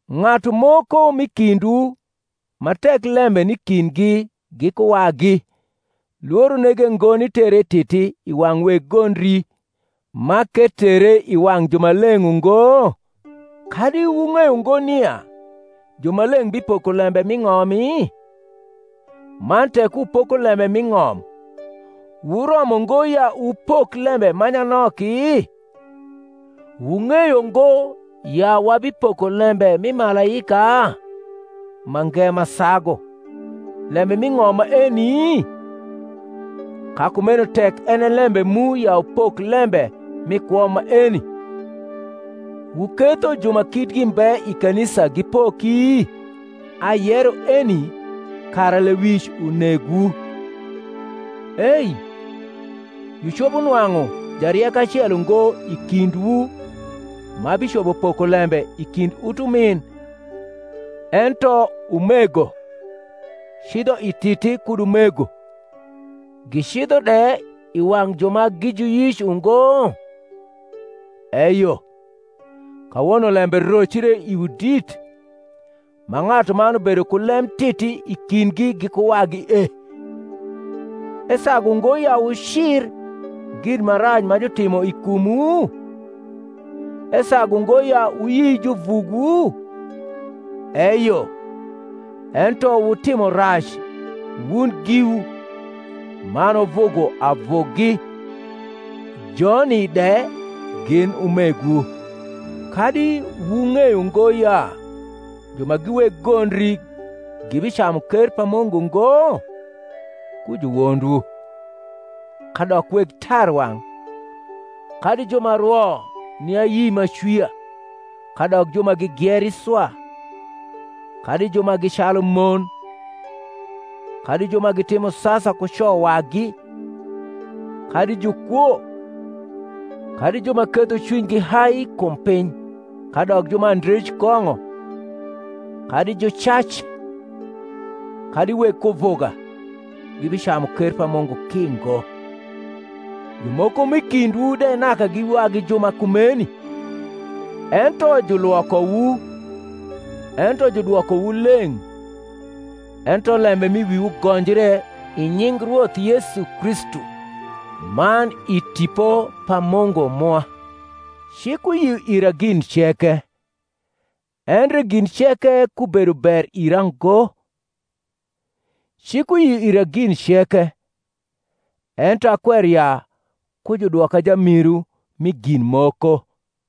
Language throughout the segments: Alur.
Ng’atu moko m’i kindwu, ma tek lembe ni i kindgi giku wagi, lworo nege ngo nitere i titi i wang’ weg gondri, ma k’etere i wang’ jumaleng’ ungo? Kadi wung’eyo ngo nia jumaleng’ bipoko lembe mi ng’omi? man tek wupoko lembe mi ng’om, wuromo ngo ya wupok lembe ma nyanoki? Wung’eyo ngo ya wabipoko lembe mi malaika? mange ma sagu, lembe mi ng’om maeni? Ka kumeno tek en e lembe mu ya wupok lembe mi kwo maeni, wuketho ju ma kitgi mbe i kanisa gipoki? Ayero eni kara lewic unegwu. Ei, jucopo nwang’u jarieko acel ungo i kindwu ma bicopo poko lembe i kind utumin, ento umego cidho i titi kud umego, gicidho de i wang’ ju ma gi juyic ungo? Eyo, kawono lembe rocre iwu dit, ma ng’atuman bedo ku lem titi i kindgi giku wadi e. Esagu ngo ya wucir gin ma rac ma jutimo i kumwu? esagu ngo ya wuyi juvugwu? Eyo, ento wutimo rac wun giwu, man wuvugo avugi, joni de gin umegwu. Kadi wung’eyo ngo ya ju ma gi weg gondri gibicamu ker pa Mungu ngo? ku juwondwu: kadok weg tarwang’, kadi ju ma rwo ni ayi m’acwia, kadok ju ma gigieri swa, kadi ju ma gi calu mon, kadi ju ma timo sasa ku co wagi, kadi jukwo, kadi ju ma ketho cwinygi hai kum piny, kadok ju ma andrej kong’o, kadi jucac, kadi weg kuvuga, gibicamu ker pa Mungu ki ngo. Jumoko m’i kindwu de naka gi wagi ju ma kumeni: ento julwokowu, ento judwokowu leng’, ento lembe m’i wiwu gonjre i nying Rwoth Yesu Kristu, man i Tipo pa Mungu mwa. Cik uyio ira gin ceke; endre gin ceke kubedo ber ira ngo. Cik uyio ira gin ceke; ento akwero ya ku judwoka jamiru mi gin moko.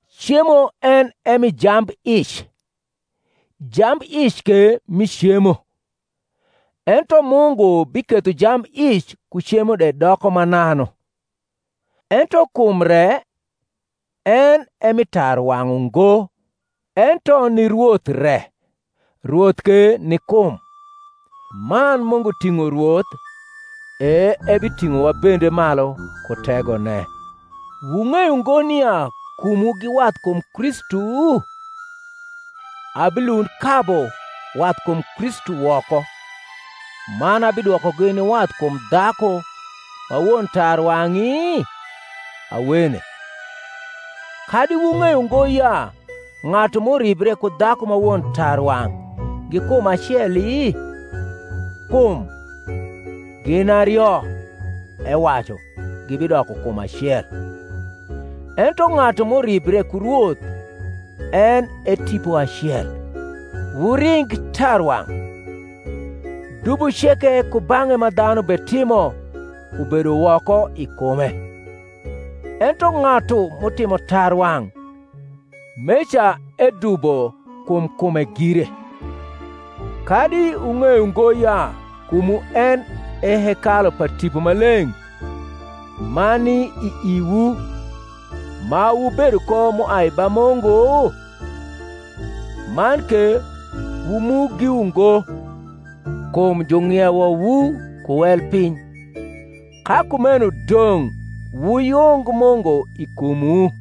Cemo en e mi jambic, jambic ke mi cemo: ento Mungu biketho jambic ku cemo de doko mananu. Ento kum re en e mi tarwang’ ungo, ento ni Rwoth re; Rwoth ke ni kum: man Mungu ting’o Rwoth, e ebiting’owa bende malu ku tegone. Wung’eyo ngo nia kumwu gi wathkum Kristu? abilund kabu wathkum Kristu woko, man abidwokogi ni wathkum dhaku ma won tarwang’i? Awene. Kadi wung’eyo ngo ya ng’atu m’uribre ku dhaku ma won tarwang’ gi kum aceli? kum, Gin ario, ewacu, gibidoko kum acel. Ento ng’atu m’uribre ku Rwoth en e tipo acel. Wuring tarwang’. Dubo ceke kubang’e ma dhanu betimo ubedo woko i kume; ento ng’atu m’utimo tarwang’ meca edubo kum kume gire. Kadi wung’eyo ngo ya kumwu en e hekalu pa Tipo Maleng’ ma ni i iwu, ma wubedo ko m’uai ba Mungu? man ke wu mu giwu ngo; kum jung’iewowu ku wel piny: ka kumeno dong’ wuyung Mungu i kumwu.